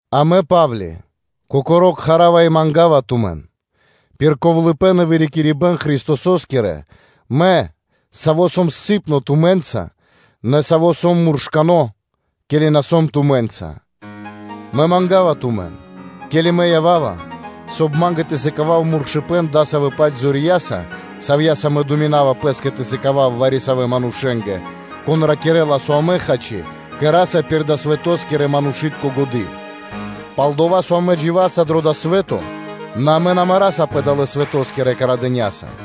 А мэ, Па́вли, кокоро́, манга́ва тумэн пир напхувитко ковлыпэн Христосо́скиро, мэ, саво́ сом ковлэ́-илы́тко тумэ́нца, нэ саво́ сом муршкано́, ке́ли мэ на сом тумэ́нца; мэ манга́ва тумэн, ке́ли мэ ява́ва, соб (кай) ма́нгэ тэ сыкавав муршыпэн дасавэ́-паць зорья́са, савья́са мэ думинава пэ́скэ тэ сыкавав вари-савэ́ манушэ́нгэ, кон ракирэ́ла, со амэ, хачи, кэра́са пир далэ́ свэто́скирэ-манушы́тко годы́. Пал-дова́ со амэ дживаса пэ дава́ свэ́то, нэ амэ на марасапэ далэ́-свэто́скирэ годя́са.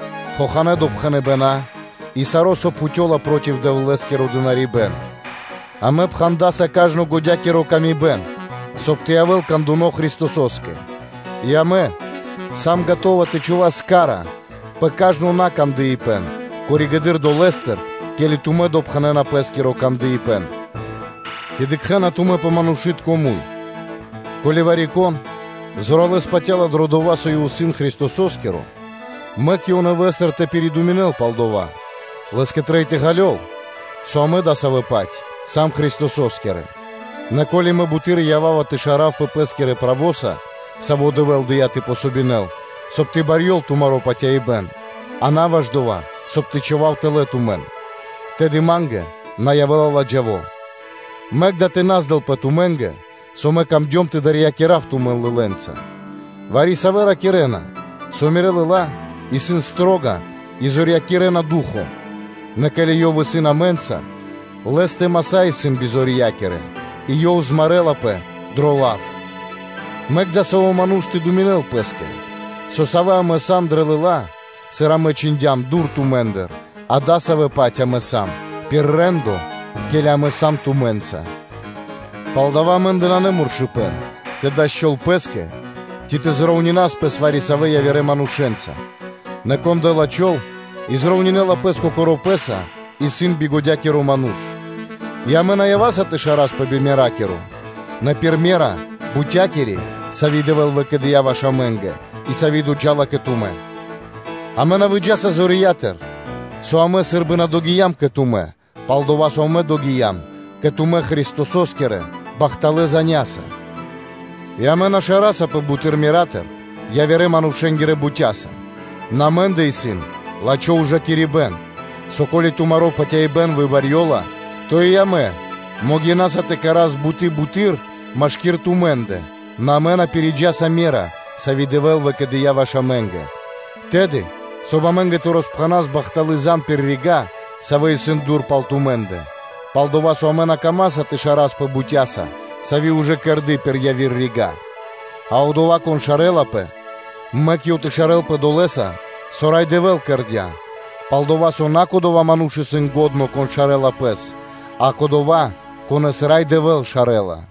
хоханэ́ допхэныбэна и саро́, со пхутёла проти Дэвлэ́скиро дынарибэ́н; амэ пхандаса кажно годя́кири мы́сля, соб (кай) тэ явэ́л кандуны Христосо́скэ; и амэ сам скэдынэ́ тэ чхувас хась (ка́ра) пэ кажно накандыпэн пало́ (после) дова́, ке́ли тумэ́ допхэнэна пэ́скиро кандыпэн. Ци дыкхэ́на тумэ́ пэ манушы́тко муй? Ко́ли вари-кон зоралэ́с патя́ла дро дова́, со ёв исын Христосо́скиро, мэк ёв нэвэ́стыр тэ пиридуминэл пал дова́; лэ́скэ трэй тэ ґалёл, со амэ дасавэ́-паць сам Христосо́скирэ. Нэ, ко́ли мэ буты́р ява́ва тэ шаравпэ пэ́скирэ правоса, саво́ Дэвэ́л дыя́ тэ дав васт, соб (кай) тэ барьёл тумаро́ патяибэ́н, а на ваш дова́, соб (кай) тэ чхував тэлэ́ тумэн, тэды ма́нгэ на явэ́ла ладжаво; мэк дава́ тэ на здэлпэ тумэ́нгэ, со мэ камдём тэ дарьякирав (тэ страхакирав) тумэн лылэ́нца: вари-савэ́ ракирэ́на, со мирэ́ лыла́ исын строга и зорьякирэна ду́хо (фа́но), нэ ке́ли ёв исын амэ́нца, нэ лэ́стэ маса́ исын бизорья́кирэ и лэ́скиро лав исын наджиндло. Мэк дасаво ману́ш тэ думинэл пэ́скэ, со, савэ́ амэ сам дрэ лыла́, сыр амэ чхиндям дур тумэ́ндыр, адасавэ́-паць амэ сам пир рэ́ндо, ке́ли амэ сам тумэ́нца. Палдава́ амэ́ндэ нанэ муршыпэн тэ дас чол (тими́н) пэ́скэ ци тэ припарувас (тэ зроўнина́с) пэс вари-савэ́ явирэ манушэ́нца; нэ кон дэ́ла чол и припарувэла пэс кокоро́ пэ́са, исын бигодякиро ману́ш. И амэ на ява́са тэ шараспэ би меракиро, нэ пир ме́ра бутякири, сави́ Дэвэ́л выкэдыя́ ваш амэ́нгэ и сави́ доджа́ла кэ тумэ́. Амэ на выджаса зорья́тыр, со амэ сы́рбы на догиям кэ тумэ́, пал-дова́ со амэ догиям кэ тумэ́ Христосо́скирэ бахталэ́ заня́са (звесяса); и амэ на шарасапэ буты́р мера́тыр явирэ́-манушэ́нгирэ бутяса, нэ амэ́ндэ исын лачхо́ ужакирибэ́н, со, ко́ли тумаро́ патяибэ́н выбарьёла, то и амэ могинаса тэ кэра́с буты́ буты́р машки́р тумэ́ндэ, нэ амэ на пириджаса ме́ра, сави́ Дэвэ́л выкэдыя́ ваш амэ́нгэ, тэды, соб (кай) амэ́нгэ тэ роспхэнас бахталы́ зан (звесь) пир рига́, савэ́ исын дур пал тумэ́ндэ, пал-дова́ со амэ на камаса тэ шараспэ бутяса, сави́ ужэ кэрды пир яви́р рига́. А одова́, кон шарэлапэ, мэк ёв тэ шарэлпэ долэса, со Рай Дэвэ́л кэрдя́. Пал-дова́ со на кодова́ ману́ш исын лачхо́, кон шарэла пэс, а кодова́, конэ́с Рай Дэвэ́л шарэла.